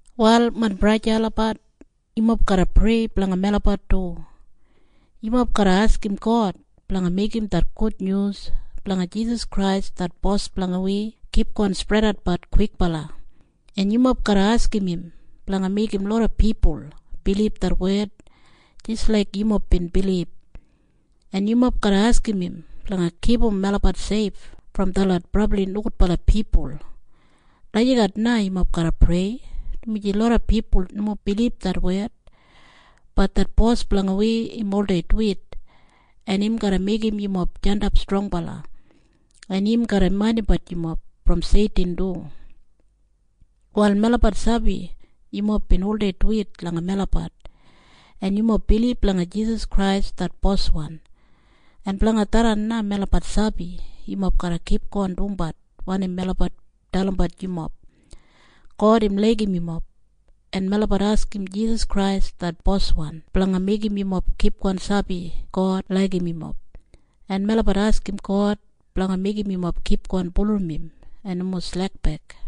Wal main braja en sista olabat, yumob garra prei blanga melabat du. Yumob garra askim God blanga meigim det gudnyus blanga Jisas Krais det Bos blanga wi kipgon spredatbat kwikbala, en yumob garra askim im blanga meigim loda pipul bilib det wed jis laik yumob bin bilib, en yumob garra askim im blanga kipum melabat seif brom detlot brabli nogudbala pipul. Lagijat na yumob garra prei, dumaji loda pipul nomo bilib det wed. Bat det Bos blanga wi im oldei duwit, en im garra meigim yumob jandap strongbala, en im garra maindimbat yumob brom Seitin du. Wal melabat sabi yumob bin oldei duwit langa melabat, en yumob bilib langa Jisas Krais det Boswan, en blanga tharran na melabat sabi yumob garra kipgon dumbat wanim melabat dalimbat yumob. God im laigim yumob, en melabat askim Jisas Krais det Boswan blanga meigim yumob kipgon sabi God laigim yumob, en melabat askim God blanga meigim yumob kipgon bulurrum im en nomo slekbek.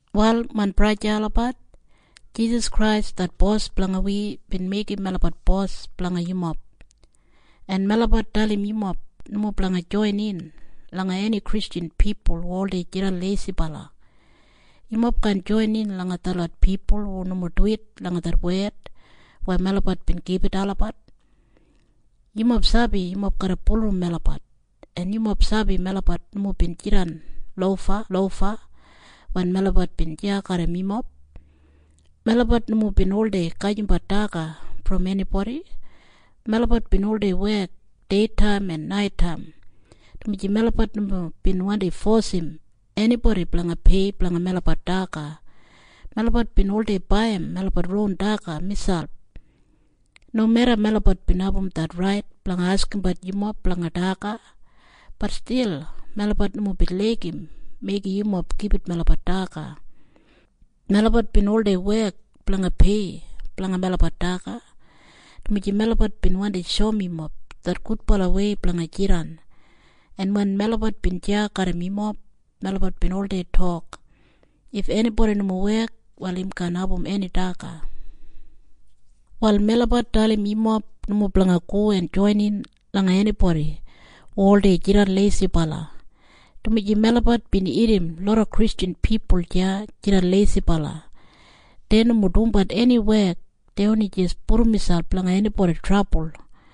Wal main braja en sista olabat, Jisas Krais det Bos blanga wi bin meigim melabat bos blanga yumob. En melabat dalim yumob nomo blanga joinin langa eni Kristjan pipul hu oldei jidan leisibala. Yumob kaan joinin langa detlot pipul hu nomo duwit langa det wed weya melabat bin gibit olabat. Yumob sabi yumob garra bulurrum melabat, en yumob sabi melabat nomo bin jidan lofalofa wen melabat bin deya garram yumob. Melabat nomo bin oldei gajimbat daga brom enibodi. Melabat bin oldei wek deitaim en naitaim, dumaji melabat nomo bin wandi fosim enibodi blanga pei blanga melabat daga. Melabat bin oldei baiyim melabat ron daga miselp. Nomeda melabat bin abum det rait blanga askimbat yumob blanga daga, bat stil melabat nomo bin laigim meigim yumob gibit melabat daga. Melabat bin oldei wek blanga pei blanga melabat daga, dumaji melabat bin wandi shoum yumob det gudbalawei blanga jidan. En wen melabat bin deya garram yumob, melabat bin oldei tok, “If enibodi nomo wek, wal im kaan abum eni daga.” Wal melabat dalim yumob nomo blanga go en joinin langa enibodi hu oldei jidan leisibala, dumaji melabat bin irrim loda Kristjan pipul deya jidan leisibala. Dei nomo dumbat eni wek. Dei oni jis pudum miselp langa enibodi trabul.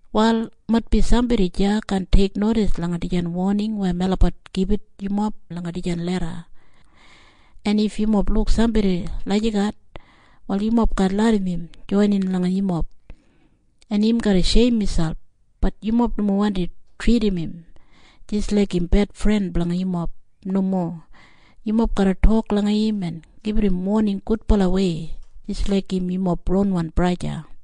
Wal maitbi sambodi deya kaan teiknodis langa dijan woning weya melabat gibit yumob langa dijan leda. En if yumob luk sambodi lagijat, wal yumob kaan larram im joinin langa yumob. En im garra sheim miselp. Bat yumob nomo wandi tridim im jis laik im bedfren blanga yumob. Nomo. Yumob garra tok langa im en gibit im woning gudbalawei jis laik im yumob ronwan braja o sista.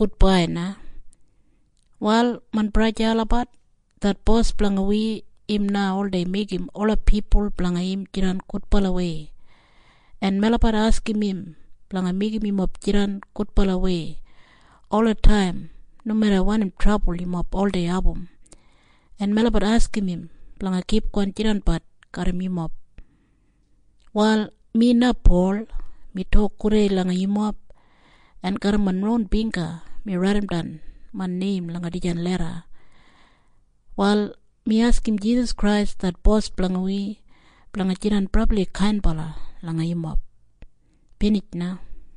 Prayer Wal main braja en sista olabat, det Bos blanga wi im na oldei meigim ola pipul blanga im jidan gudbalawei. En melabat askim im blanga meigim yumob jidan gudbalawei olataim nomeda wanim trabul yumob oldei abum, en melabat askim im blanga kipgon jidanbat garram yumob. Wal mi na, Pol, mi tok gudei langa yumob, en garram main ron bingga mi raidimdan main neim langa dijan leda. Wal mi askim Jisas Krais det Bos blanga wi blanga jidan brabli kainbala langa yumob. Binij na.